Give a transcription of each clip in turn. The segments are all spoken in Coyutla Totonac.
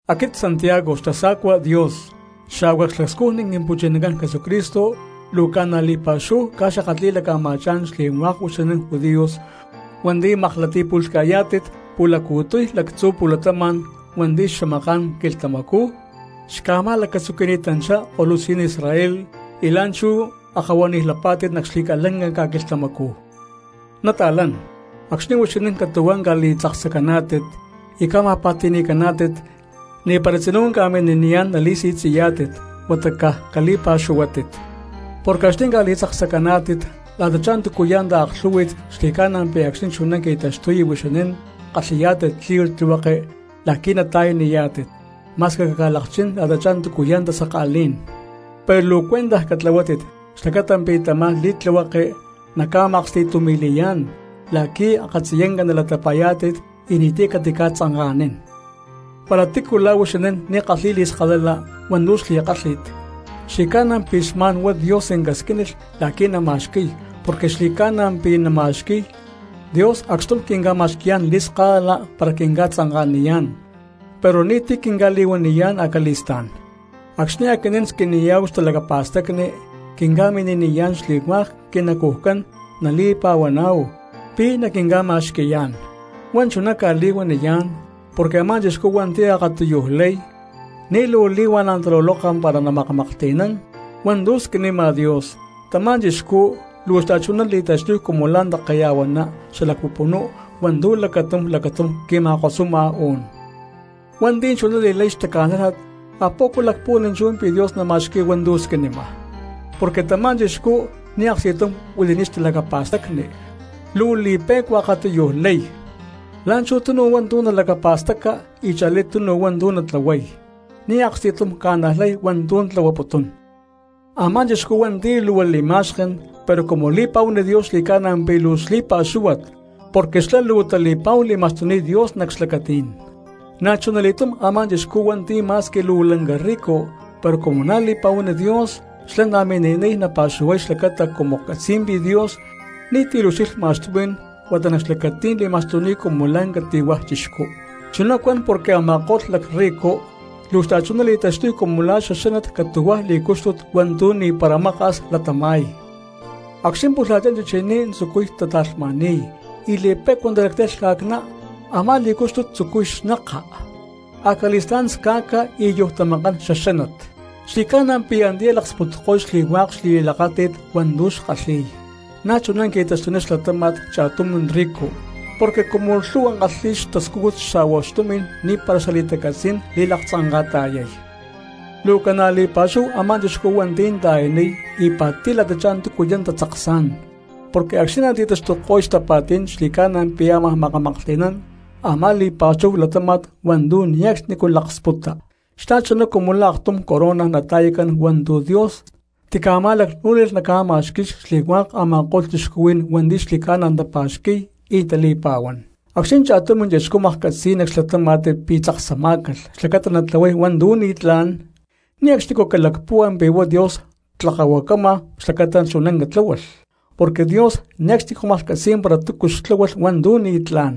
Aquit Santiago xtasa̠cua Dios xa̠hua xlacscujni Quimpu̠chinacán Jesucristo, luu ca̠na li̠pa̠xúhu cca̠xakatli̠laca̠ma̠chá̠n xli̠hua̠k huixinín judíos hua̠nti̠ makli̠tapu̠lhca̠yá̠tit pu̠laccu̠tiy lactzu̠ pu̠latama̠n hua̠nti̠ xamaká̠n quilhtamacú xca̠ma̠lacatzuqui̠ni̠tanchá ko̠lutzí̠n Israel y la̠nchú akahuanij lapá̠tit nac xli̠ca̠lanca ca̠quilhtamacú. Nata̠lán, acxni̠ huixinín catu̠huá ca̠li̠tzaksacaná̠tit y ca̠ma̠pa̠ti̠ni̠caná̠tit ni̠para tzinú ca̠mini̠niyá̠n nali̠si̠tzi̠yá̠tit huata caj cali̠pa̠xuhuátit. Porque acxni̠ ca̠li̠tzaksacaná̠tit la̠tachá túcuya̠ taaklhú̠hui̠t xli̠ca̠na pi̠ acxni̠ chuná qui̠taxtuy huixinín kalhi̠yá̠tit li̠tlihueke la̠qui̠ nata̠yaniyá̠tit ma̠squi caca̠lakchín la̠tachá túcuya̠ tasaka̠lí̠n. Pero luu cuentaj catlahuátit xlacata pi̠ tamá li̠tlihueke naca̠ma̠aksti̠tumi̠li̠yá̠n, la̠qui akatziyanca nalatapa̠yá̠tit y ni̠ti̠ catica̠tzanka̠nín. Para tícu la̠ huixinín ni̠ kalhi̠y li̠skalala hua̠ntu̠ xli̠kálhi̠t, xli̠ca̠na pi̠ xma̠n huá Dios casquínilh la̠qui̠ nama̠xqui̠y porque xli̠ca̠na pi̠ nama̠xqui̠y; Dios acxtum quinca̠ma̠xqui̠yá̠n li̠skalala para quinca̠tzanka̠niyá̠n pero ni̠ti̠ quinca̠li̠huaniyá̠n acali̠stá̠n. Acxni̠ aquinín squiniyá̠hu xtalacapa̠stacni quinca̠mini̠niyá̠n xli̠hua̠k quinacujcán nali̠pa̠huaná̠hu pi̠ naquinca̠ma̠xqui̠yá̠n. Huá chuná cca̠li̠huaniyá̠n porque a̠má cristianos hua̠nti̠ akatiyuj lay ni̠ luu li̠huana̠ taluloka para namaklhti̠nán hua̠ntu̠ squinima Dios, tamá cristiano luu xta̠chuná li̠taxtuy cumu la̠ ta̠keya̠huaná xalac pupunú hua̠ntu̠ lacatum lacatum qui̠ma̠kosuma uú̠n. Hua̠nti̠ chuná li̠lay xtaca̠nájlat, ¿a poco lacpuhuán chú pi̠ Dios nama̠xqui̠y hua̠ntu̠ squinima? Porque tamá cristiano ni̠ aksti̠tum huili̠ni̠t xtalacapa̠stacni, luu li̠pe̠cua akatiyuj lay, la̠nchú tunu hua̠ntu̠ nalacapa̠staca y cha̠lí tunu hua̠ntu̠ natlahuay, ni̠ aksti̠tum ca̠najlay hua̠ntu̠ tlahuaputún. Amá cristiano hua̠nti̠ luu li̠ma̠xken pero cumu li̠pa̠huán Dios xli̠ca̠na pi̠ luu xli̠pa̠xúhuat porque xlá luu tali̠pa̠hu li̠ma̠xtuni̠t Dios nac xlacatí̠n. Na̠chunali̠túm a̠má chixcú hua̠nti̠ ma̠squi luu lanca rico pero cumu na̠ li̠pa̠huán Dios xlá na̠ mini̠niy napa̠xuhuay xlacata cumu catzi̠y pi̠ Dios ni̠ti̠ liucxilhma xtumi̠n huata nac xlacatí̠n li̠ma̠xtuni̠t cumu la̠ cati̠huaj chixcú. Chuná cuan porque a̠ma̠ko̠lh lacrrico luu xta̠chuná tali̠taxtuy cumu la̠ xaxánat catu̠huaj li̠cúxtut hua̠ntu̠ ni̠para maka̠s latama̠y. Acxni̠ pulhachá chichiní tzucuy tata̠lhma̠ni̠y y li̠pe̠cua talactay lhca̠cná, a̠má li̠cúxtut tzucuy xneka, acali̠stá̠n sca̠ca y yujtamakán xaxánat, xli̠ca̠na pi̠ antiyá laksputko̠y xli̠hua̠k xli̠li̠lakáti̠t hua̠ntu̠ xkalhi̠y. Na̠chuná qui̠taxtuniy xlatáma̠t cha̠tum rico porque cumu lhu̠hua kalhi̠y xtascújut xa̠hua xtumi̠n ni̠para xali̠tacatzí̠n li̠laktzanka̠ta̠yay. Luu ca̠na li̠pa̠xúhu a̠má cristiano hua̠nti̠ ta̠yaniy y pa̠ti̠y la̠tachá túcuya̠ tatzaksá̠n, porque acxni̠ nati̠taxtuko̠y xtapa̠tí̠n xli̠ca̠na pi̠ ámaj maklhti̠nán a̠má li̠pa̠xúhu latáma̠t hua̠ntu̠ ne̠cxnicú laksputa, xta̠chuná cumu la̠ aktum corona nata̠i̠cán hua̠ntu̠ Dios tica̠ma̠lacnú̠nilh naca̠ma̠xqui̠y xli̠hua̠k a̠ma̠ko̠lh cristianos hua̠nti̠ xli̠ca̠na tapa̠xqui̠y y tali̠pa̠huán. Acxni̠ cha̠tum cristiano maklhcatzi̠y nac xlatáma̠t pi̠ tzaksamá̠calh xlacata natlahuay hua̠ntu̠ ni̠tlá̠n, ne̠cxnicú calacpúhua pi̠ huá Dios tlakahuacama xlacata chuná catláhualh, porque Dios ne̠cxnicú maklhcatzi̠y para túcu xtláhualh hua̠ntu̠ ni̠tlá̠n,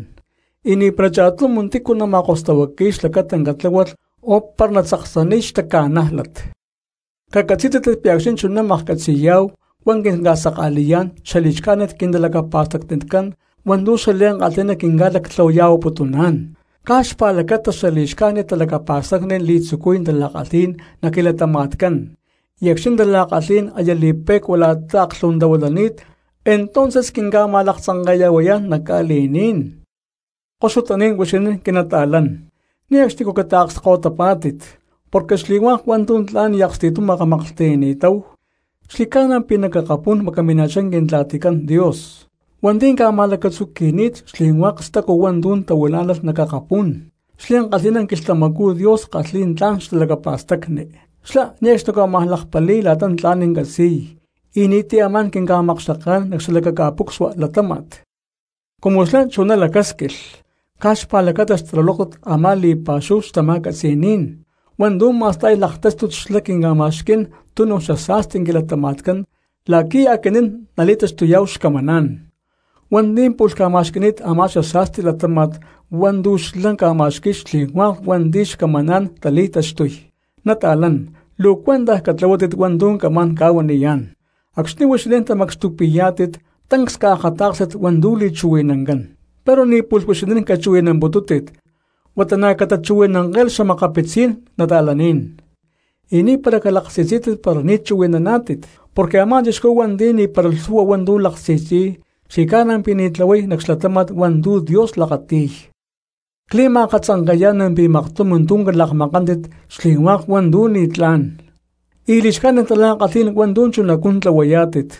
y ni̠para cha̠tum tícu ma̠kostahuaqui̠y xlacata catláhualh o para natzaksaniy xtaca̠nájlat. Cacatzí̠tit pi̠ acxni̠ chuná maklhcatzi̠yá̠hu huá quinca̠saka̠li̠yá̠n xali̠xcájnit quintalacapa̠stacnicán hua̠ntu̠ xli̠ankalhi̠ná quinca̠lactlahuaya̠huaputuná̠n. Caj xpa̠lacata xali̠xcájnit talacapa̠stacni li̠tzucuy tala̠kalhí̠n nac quilatama̠tcán, y acxni̠ tala̠kalhí̠n aya li̠pe̠cua la̠ta aclhu̠huantahuilani̠t entonces quinca̠ma̠laktzanke̠ya̠huayá̠n nac ca̠li̠ní̠n. Koxutaní̠n huixinín quinata̠lán, ne̠cxnicú cataakskahuitapá̠tit, porque xli̠hua̠k hua̠ntu̠ tla̠n y aksti̠tum makamaklhti̠nani̠táhu xli̠ca̠na pi̠ nac akapú̠n macamima̠chá Quintla̠ticán Dios hua̠nti̠ ca̠ma̠lacatzuqui̠ni̠t xli̠hua̠k stacu hua̠ntu̠ tahuilá̠nalh nac akapú̠n. Xliankalhi̠ná quilhtamacú Dios kalhi̠y tla̠n xtalacapa̠stacni, xlá ne̠cxnicú ámaj lakpali̠y la̠ta tla̠n catzi̠y y ni̠ti̠ amá̠n quinca̠makxteká̠n nac xalakaca̠pucsua latáma̠t. Cumu xlá chuná lacásquilh, caj xpa̠lacata xtalulóktat a̠má li̠pa̠xúhu xtama̠catzi̠ní̠n hua̠ntu̠ ma̠sta̠y laktáxtut xlá quinca̠ma̠xquí̠n túnu xasa̠sti quilatama̠tcán la̠qui̠ aquinín nali̠taxtuyá̠hu xcamaná̠n hua̠nti̠ pu̠lh ca̠ma̠xqui̠ni̠t a̠má xasa̠sti latáma̠t hua̠ntu̠ xlá ca̠ma̠xqui̠y xli̠hua̠k hua̠nti̠ xcamaná̠n tali̠taxtuy. Nata̠lán, luu cuentaj catlahuátit hua̠ntu̠ camá̠n ca̠huaniyá̠n: acxni̠ huixinín tamacxtupi̠yá̠tit tancs caakatá̠kstit hua̠ntu̠ li̠chuhui̠nancán, pero ni̠ pu̠lh huixinín cachuhui̠namputútit huata na̠ catachuhui̠nanke̠lh xa̠makapitzí̠n cristianos, y ni̠para calaksi̠tzí̠tit para ni̠ chuhui̠nántit. Porque a̠má cristiano hua̠nti̠ ni̠para lhu̠hua hua̠ntu̠ laksi̠tzi̠y xli̠ca̠na pi̠ ni̠ tlahuay nac xlatáma̠t hua̠ntu̠ Dios lakati̠y. Cli̠ma̠katzanke̠yá̠n pi̠ maktum tu̠ calakmakántit xli̠hua̠k hua̠ntu̠ ni̠tlá̠n y li̠xcájnit tala̠kalhí̠n hua̠ntu̠ chunacú tlahuayá̠tit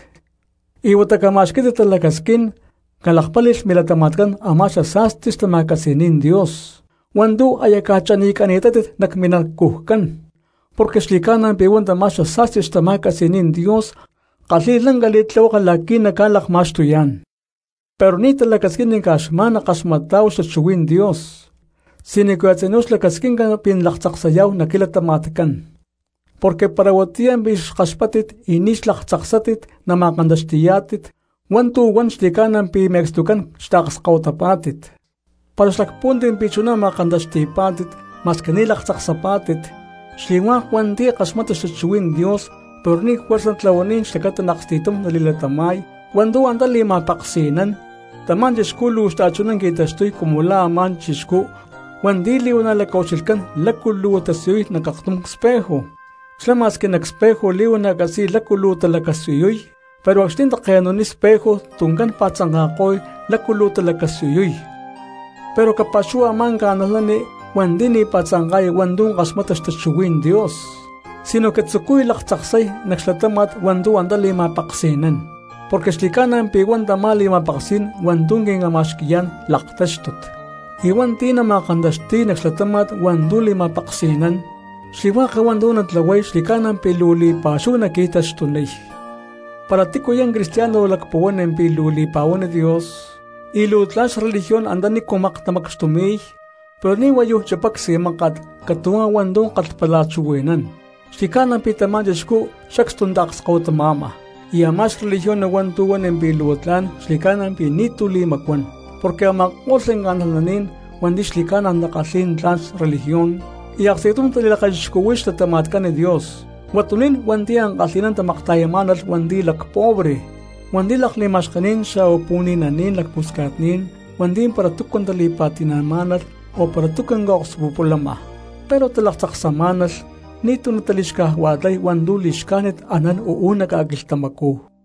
y huata cama̠xquí̠tit talacasquín calakpáli̠lh milatama̠tcán a̠má xasa̠sti xtama̠catzi̠ní̠n Dios hua̠ntu̠ aya ca̠chanicani̠tátit nac minacujcán; porque xli̠cána pi̠ huá tamá xasa̠sti xtama̠catzi̠ní̠n Dios kalhi̠y lanca li̠tlihueke la̠qui̠ naca̠lakma̠xtuyá̠n. Pero ni̠ talacasquín caj xma̠n nakaxmatá̠hu xtachuhuí̠n Dios, sinoque a̠tzinú xlacasquinca pi̠ nalaktzaksayá̠hu nac quilatama̠tcán, porque para huatiyá pi̠ xkaxpáttit y ni̠ xlaktzaksátit nama̠kantaxti̠yá̠tit hua̠ntu̠ huan xli̠ca̠na pi̠ me̠cstucán xtaakskahuitapá̠tit para xlacpuhuántit pi̠ chuná ma̠kantaxti̠pá̠tit ma̠squi ni̠ laktzaksapá̠tit. Xli̠hua̠k hua̠nti̠ kaxmata xtachuhuí̠n Dios pero ni̠ juerza tlahuaniy xlacata aksti̠tum nali̠latama̠y hua̠ntu̠ antá li̠ma̠peksi̠nán, tamá cristiano luu xta̠chuná qui̠taxtuniy cumu la̠ a̠má chixcú hua̠nti̠ li̠huana̠ lacaucxilhcán lácu luu tasiyuy nac aktum espejo, xlá ma̠squi nac espejo li̠huana̠ catzi̠y lácu luu talacasiyuy pero acxni̠ take̠nu̠niy espejo tuncán pa̠tzanka̠ko̠y lácu luu talacasiyuy. Pero capa̠xúhualh a̠má cristiano hua̠nti̠ ni̠ pa̠tzanka̠y hua̠ntu̠ kaxmata xtachuhuí̠n Dios sinoque tzucuy laktzaksay nac xlatáma̠t hua̠ntu̠ antá li̠ma̠peksi̠nán, porque xli̠ca̠na pi̠ huá tamá li̠ma̠peksí̠n hua̠ntu̠ quinca̠ma̠xqui̠yá̠n laktáxtut, y hua̠nti̠ nama̠kantaxti̠y nac xlatáma̠t hua̠ntu̠ li̠ma̠peksi̠nán, xli̠hua̠k hua̠ntu̠ natlahuay xli̠ca̠na pi̠ luu li̠pa̠xúhu naqui̠taxtuniy. Para tícuya̠ cristiano lacpuhuán pi̠ luu li̠pa̠huán Dios y luu tla̠n xreligión antanícu maktamacxtumi̠y, pero ni̠ huayuj chipay csi̠máka̠t catu̠huá hua̠ntu̠ kalhpalachuhui̠nán, xli̠ca̠na pi̠ tamá chixcú sacstu taakskahuitama̠ma, y a̠má xreligión hua̠ntu̠ huan pi̠ luu tla̠n xli̠ca̠na pi̠ ni̠ti̠ li̠macuán. Porque a̠ma̠ko̠lh cristianos hua̠nti̠ xli̠ca̠na takalhi̠y tla̠n religión y aksti̠tum tali̠lakachixcuhui̠y xlatama̠tcán Dios, huatuní̠n hua̠nti̠ ankalhi̠ná tamakta̠yamá̠nalh hua̠nti̠ lacpobre hua̠nti̠ lakli̠ma̠xkení̠n xa̠hua pu̠ni̠naní̠n lacpusca̠tní̠n hua̠nti̠ para túcu tali̠pa̠ti̠má̠nalh o para túcu ca̠akspulama, pero talaktzaksamá̠nalh ni̠ti̠ natali̠xcajua̠lay hua̠ntu̠ li̠xcájnit anán uú nac ca̠quilhtamacú.